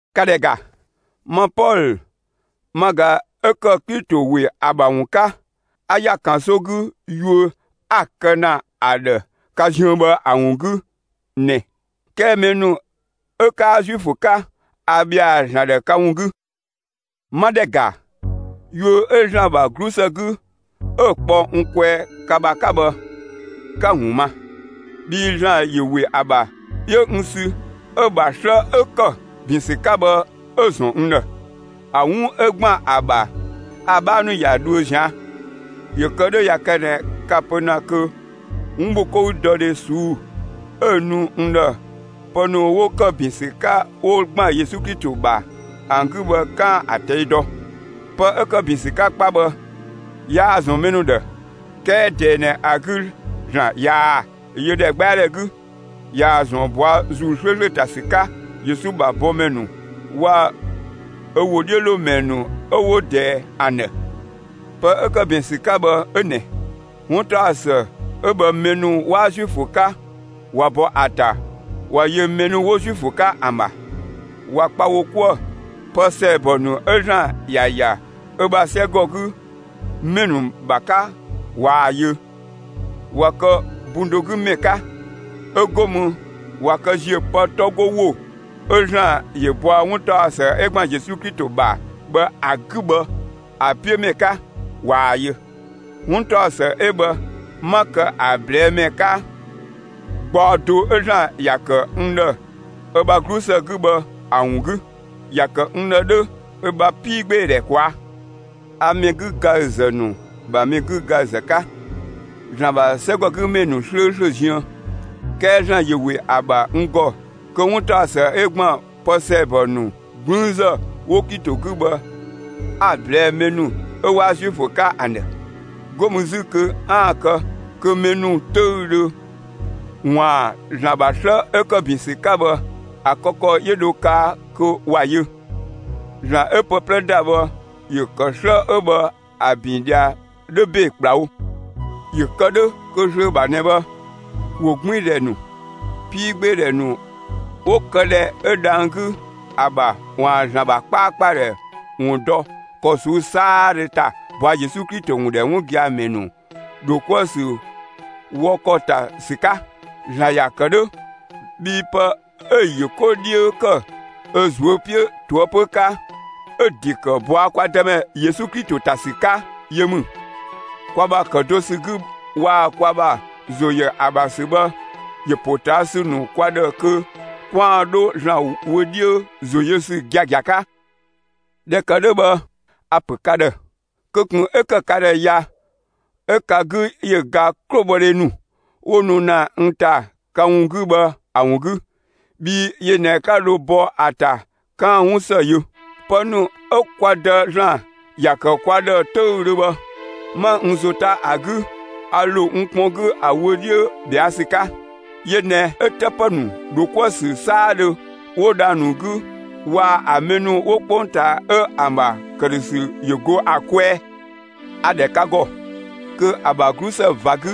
‑Ka ‑dhɛ ‑ga! Ma Pɔlö ma ꞊ga 'ö ‑kë Klito ‑we ‑a ‑bha ‑wun 'ka 'a ‑ya ‑kanso 'gü yuö 'a‑ kë ‑na ‑a ‑dhë ka ziën bhë ‑a ‑wun 'gü ꞊nɛ. 'Kɛɛ mɛ ‑nu 'ö 'kaa Zuifö 'ka, a ‑bhɛa ‑Zlan ‑dhë ka ‑wun 'gü. 'Ma ‑dhɛ ‑ga, yuö 'ö ‑Zlan ‑bha 'glusë 'gü 'ö‑ kpɔ n kwɛɛ ka ‑bha 'ka bhë, 'ka‑ ‑wun ma. Bhii ‑Zlan ‑yö ‑we ‑a ‑bha 'yö n sü 'ö‑ ‑bha 'slë 'ö ‑kë ‑bin ‑sü 'ka bhë 'ö‑ ‑zɔn n ‑dhë. (A 'wun 'ö ‑gban ‑a ‑bha ‑a 'bhaa ‑nu ‑ya dhuö zian. ‑Yö kë 'dhö, ꞊ya kë ꞊nɛ ka‑ pö ‑na kö 'wunbhokoudɔdhe ꞊suu'‑ 'ö‑ nu n ‑dhë pë ‑nu 'wo ‑kë ‑bin ‑sü 'ka 'wo ‑gban Yesu Klito ‑bha ‑an 'gü bhë 'kaan‑ ‑a ꞊tɛi' dɔ.) Pë 'ö ‑kë ‑bin ‑sü 'ka 'kpa bhë, yaa‑ ‑zɔn mɛ ‑nu ‑dhë; 'kɛɛ ꞊dɛɛ ꞊nɛ ‑a 'gü, ‑Zlan ꞊yaa‑ yö ‑dhɛgbɛadhɛ 'gü, ꞊yaa‑ ‑zɔn ꞊bɔa' ‑Zuu 'slööslö ‑ta ‑sü 'ka Yesu ‑bha bɔmɛ ‑nu waa‑ ö ‑wodhiölomɛ ‑nu 'ö 'wo ꞊dɛɛ ‑an ‑dhë. Pë 'ö ‑kë ‑bin ‑sü 'ka bhë 'ö ꞊nɛ: 'Wuntaɔsë 'ö bhë mɛ ‑nu 'waa Zuifö 'ka ꞊wa bɔ ‑a ‑ta ꞊wa yö mɛ ‑nu 'wo Zuifö 'ka ‑an ‑bha, ꞊wa kpa wo 'kuë‑; pë ‑sɛɛbɔ ‑nu 'ö ‑Zlan ‑ya ‑ya ö ‑bha 'sɛgɔgümɛ ‑nu ‑bha 'ka ꞊waa‑ yö. ꞊Wa kë bun do 'gü ‑mɛ 'ka; 'ö 'go mü ꞊wa kë ‑ziö pë 'tɔ 'go ‑wo 'ö ‑Zlan ‑yö bɔa 'wuntaɔsë 'ö ‑gban Yesu Klito ‑bha bhë ‑a 'gü bhë ‑a 'piö ‑mɛ 'ka ꞊waa‑ yö. 'Wuntaɔsë 'ö bhë 'ma kë ‑a ꞊blɛɛ'‑ ‑mɛ 'ka, gbaɔ do 'ö ‑Zlan ‑ya ‑kë n ‑dhë ö ‑bha 'glusë 'gü bhë ‑a ‑wun 'gü. ‑Ya ‑kë n ‑dhë 'dhö ö ‑bha 'piigbeedhɛ ꞊kwaa'. A mɛ 'gügaüzë ‑nu ‑bha mɛ 'gügaüzë 'ka ‑Zlan ‑bha 'sɛgɔgümɛ ‑nu 'slööslö ziën; 'kɛɛ ‑Zlan ‑yö ‑we ‑a ‑bha n ‑gɔ kö 'wuntaɔsë 'ö ‑gban pë ‑sɛɛbɔ ‑nu 'gblüünzë 'wo Klito 'gü bhë 'a‑ ꞊blɛɛ'‑ mɛ ‑nu 'ö 'waa Zuifö 'ka ‑an ‑dhë. 'Go mü 'zü kö 'aan‑ kë kö mɛ ‑nu 'töüdhö ‑waan ‑Zlan ‑bha 'slë 'ö ‑kë ‑bin ‑sü 'ka bhë ‑a kë ‑kɔ 'yö dho kaa kö ‑wa yö. ‑Zlan 'ö pë 'plɛ ‑da bhë ‑yö ‑kë 'slë 'ö bhë ‑a ‑bin ꞊dhia 'dhö ‑be ‑kplawo, ‑yö kë 'dhö kö zlöö ‑bha ꞊nɛ bhë, ‑wogbiindhɛ ‑nu, 'piigbeedhɛ ‑nu 'wo këdhɛ 'ö dhang‑ 'gü ‑a ‑bha ‑waan ‑Zlan ‑bha 'kpaakpadhɛ ‑wun dɔ ‑kɔ ꞊suu'‑ 'saadhö ‑ta ꞊bɔa' Yesu ‑wun ‑dhɛ 'wun gia‑ ‑mɛ ‑nu ‑dho 'kuë‑ ‑sü wɔ ‑kɔ ‑ta ‑sü 'ka. ‑Zlan ‑ya ‑kë 'dhö bhii pë 'ö‑ ‑yö 'ko 'dhiö ‑kë ö ꞊zuö' 'piö ꞊toëpö 'ka, 'ö‑ ‑de ‑kë ꞊bɔa' kwa Dëmɛ Yesu Klito ‑ta ‑sü 'ka yö ‑mü. Kwa ‑bha ‑kë do ‑sü 'gü waa‑ kwa ‑bha ‑zo ‑yö ‑a ‑bha ‑sü bhë ‑yö ‑potaasü ‑nu kwa ‑dhë kö 'kwaan‑ 'dho ‑Zlan wö 'dhiö ‑zo yö ‑sü giagia 'ka. ꞊Dhɛ ‑kë 'dhö bhë a‑ ‑pö ka ‑dhë kö ꞊kun 'ö ‑kë ka ‑dhë ya 'ö ka 'gü ‑yö ga 'klobhɔdhe ‑nu 'wo nu ‑na n ‑ta ka ‑wun 'gü bhë ‑a ‑wun 'gü; bhii yö ꞊nɛ 'ka dho bɔ ‑a ‑ta 'kaan‑ 'wun ‑së yö. Pë ‑nu 'ö kwa Dë ‑Zlan ‑ya ‑kë kwa ‑dhë 'töüdhö bhë, 'ma n ‑zo 'ta ‑a 'gü, a ‑lo n kpɔn 'gü ‑a wö 'dhiö ꞊bhɛa' ‑sü 'ka; yö ꞊nɛ 'ö 'të ‑pë ‑nu ‑dho 'kuë‑ ‑sü 'saadhö 'wo dhang‑ ‑nu 'gü waa‑ ‑an mɛ ‑nu 'wo 'kpongtaa 'ö ‑an ‑bha ‑këdhösü ‑yö go ‑a kwɛɛ. A‑ ‑dhɛ ‑a ‑gɔ kö ‑a ‑bha 'glusë ꞊va 'gü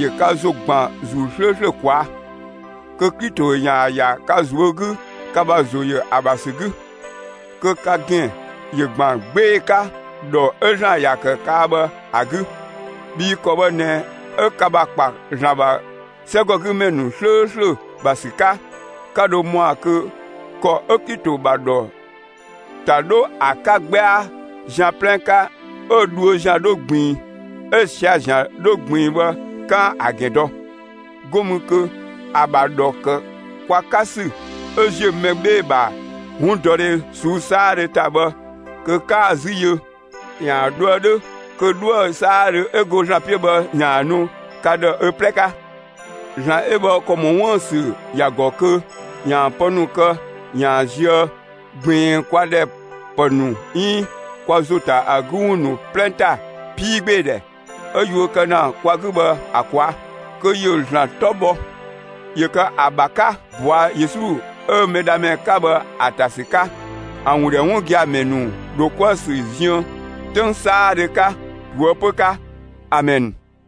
‑yö ka ‑zo ‑gban ‑Zuu 'slööslö ꞊kwaa'; kö Klito ‑yaan ‑ya ka ꞊zuö' 'gü ka ‑bha ‑zo ‑yö ‑a ‑bha ‑sü 'gü, kö ka ‑gɛn ‑yö ‑gban 'gbee‑ 'ka ‑dhɔ 'ö ‑Zlan ‑ya kë kaa bhë ‑a 'gü. Bhii ‑kɔ bhë ꞊nɛ 'ö ka ‑bha ‑kpa ‑Zlan ‑bha 'sɛgɔgümɛ ‑nu 'slööslö ‑bha ‑sü 'ka, 'ka dho ‑mɔa kö ‑kɔ 'ö Klito ‑bha ‑dhɔ ‑ta 'dho ‑a 'ka 'gbɛa ꞊zian' 'plɛ 'ka, 'ö‑ dhuö ‑zian 'dho ꞊gbiin, 'ö‑ sia‑ ‑zian 'dho ꞊gbiin bhë 'kaan‑ ‑a ‑gɛn dɔ; 'go mü kö ‑a ‑bha ‑a ‑dhɔ ‑kë kwa 'ka ‑sü 'ö ziö mɛ 'bhee‑ ‑bha 'wundɔdhe ꞊suu'‑ 'saadhö ‑ta bhë kö 'kaan‑ ‑a 'zü yö ‑yaan dhoë 'dhö kö 'dhuë‑ 'saadhö 'ö go ‑Zlan 'piö bhë ‑yaan ‑a nu ka ‑dhë ö 'plɛ 'ka. ‑Zlan 'ö bhë ‑kɔ ‑mɔ 'wuën‑ ‑sü ‑ya ‑gɔ kö ‑yaan pë ‑nu kë ‑yaan zië ꞊gbiin kwa ‑dhɛ ‑pë ‑nu 'iin kwa ‑zo ‑ta ‑a 'gü ‑wun ‑nu 'plɛ ‑ta 'piigbeedhɛ 'ö yuö kë ‑na kwa 'gü bhë ‑a ꞊kwaa'; kö ‑yö ‑Zlan 'tɔ bhɔ, ‑yö kë ‑a ‑bha 'ka bɔa Yesu 'ö Mɛdhamɛ 'ka bhë ‑a ‑ta ‑sü 'ka, ‑a ‑wun ‑dhɛ 'wun gia‑ ‑mɛ ‑nu ‑dho 'kuë‑ ‑sü ziën 'töng 'saadhö 'ka, ꞊toëpö 'ka! Amɛn.